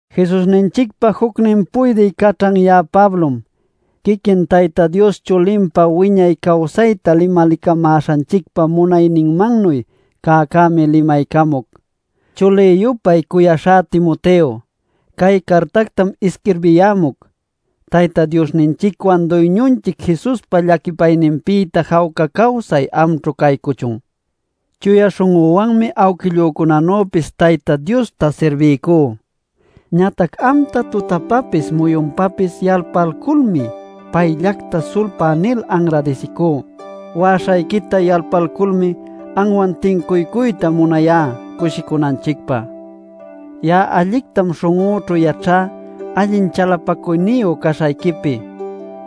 Jesusninchicpa jucnin puydï caćhan ya'a Pablom, quiquin Tayta Dios chulinpa wiñay cawsayta limalicamäśhanchicpa munaśhanmannuy cäcämi limaycamuc. Chulï-yupay cuyaśhá Timoteo, cay cartactam isquirbiyämuc. Tayta Diosninchicwan Duyñunchic Jesuspa llaquipayninpïta jawca cawsay amćhu caycuchun. Chuya śhun'üwanmi awquillücunanüpis Tayta Diosta sirbicú. Ñatac amta tutapapis muyunpapis yalpalculmi payllacta sulpá nil anradisicú. Wa'aśhayquita yalpalculmi, anwan tincuycuyta munayá cushicunanchicpä. Ya'a allictam śhun'üćhu yaćhá allin chalapacuyniyu caśhayquipi.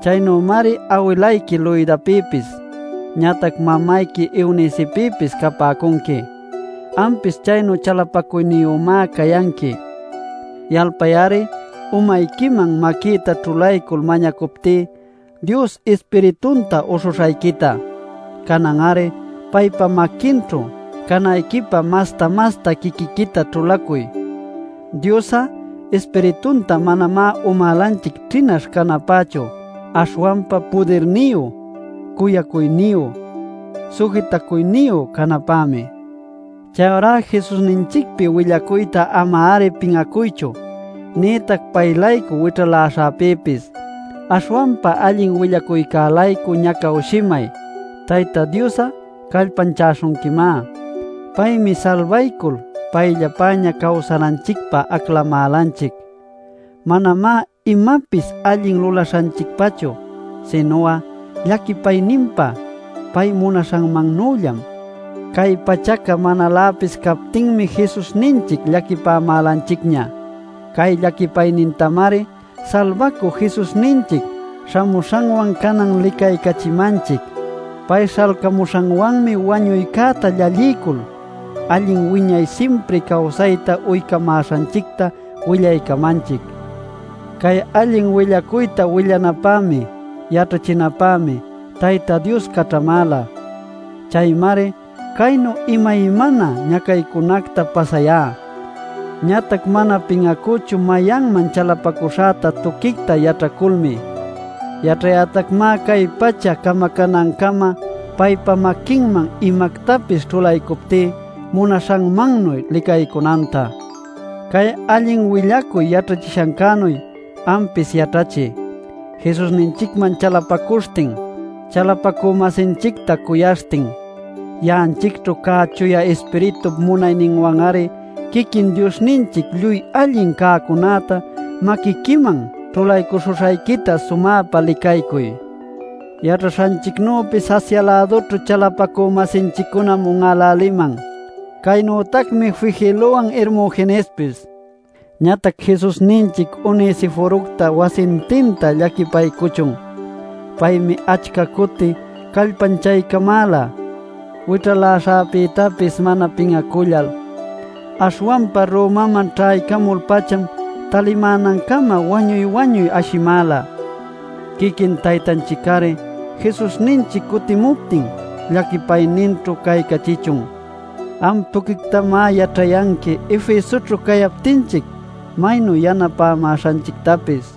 Chaynümari awilayqui Loidapïpis, ñatac mamayqui Eunicepïpis capäcunqui. Ampis chaynu chalapacuyniyümá cayanqui. Yalpay-ari umayquiman maquïta ćhulaycul mañacuptí Dios Ispiritunta uśhuśhayquita. Canan-ari paypa maquinćhu canayquipä masta-masta quiquiquita ćhulacuy. Dios'a Ispiritunta manamá umälanchic ćhinaśh canapächu aśhwanpa pudirniyu, cuyacuyniyu, sujitacuyniyu canapämi. Chayurá Jesusninchicpi willacuyta ama-ari pin'acuychu, nïtac pay-laycu wićhaläśhäpïpis. Aśhwanpa allin willacuycä-laycu ñacawshimay; Tayta Dios'a callpanchaśhunquimá. Paymi salbaycul payllapäña cawsananchicpä aclamälanchic. Manamá imapis allin lulaśhanchicpachu sinu'a llaquipayninpa pay munaśhanmannüllam. Cay pachaca manaläpis captinmi Jesusninchic llaquipämälanchicña. Cay llaquipaynintamari salbacü Jesusninchic śhamuśhanwan canan licaycachimanchic. Pay śhalcamuśhanwanmi wañuycäta llalliycul, allin wiñay simpri cawsayta uycamäśhanchicta willaycamanchic. Cay allin willacuyta willanapämi, yaćhachinapämi Tayta Dios caćhamäla. Chaymari caynu imaymana ñacaycunacta pasayá. Ñatac mana pin'acüchu mayanman chalapacuśhäta tuquicta yaćhaculmi. Yaćhayätacmá cay pacha camacanancama paypa maquinman imactapis ćhulaycuptí munaśhanmannuy licaycunanta. Cay allin willacuy yaćhachishäcänuy ampis yaćhachiy, Jesusninchicman chalapacuśhtin, chalapacü-masinchicta cuyaśhtin. Ya'anchicćhu cä Chuya Ispiritup munayninwan-ari quiquin Diosninchic lluy allin cäcunäta maquiquiman ćhulaycuśhuśhayquita sumäpa licaycuy. Yaćhaśhayquinüpis Asia-lädućhu chalapacü-masinchiccunam un'äläliman; ¡caynütacmi Figelowan Hermogenespis! Ñatac Jesusninchic Onesiforocta wasintinta llaquipaycuchun. Paymi achca cuti callpanchaycamäla, wićhaläśhäpïtapis mana pin'acullal. Aśhwanpa Romaman ćhaycamul-pacham talimänancama wañuy-wañuy ashimäla. Quiquin Taytanchic-ari Jesusninchic cutimuptin llaquipayninćhu caycachichun. Am tuquictamá yaćhayanqui Efesoćhu cayaptinchic maynu yanapämäśhanchictapis.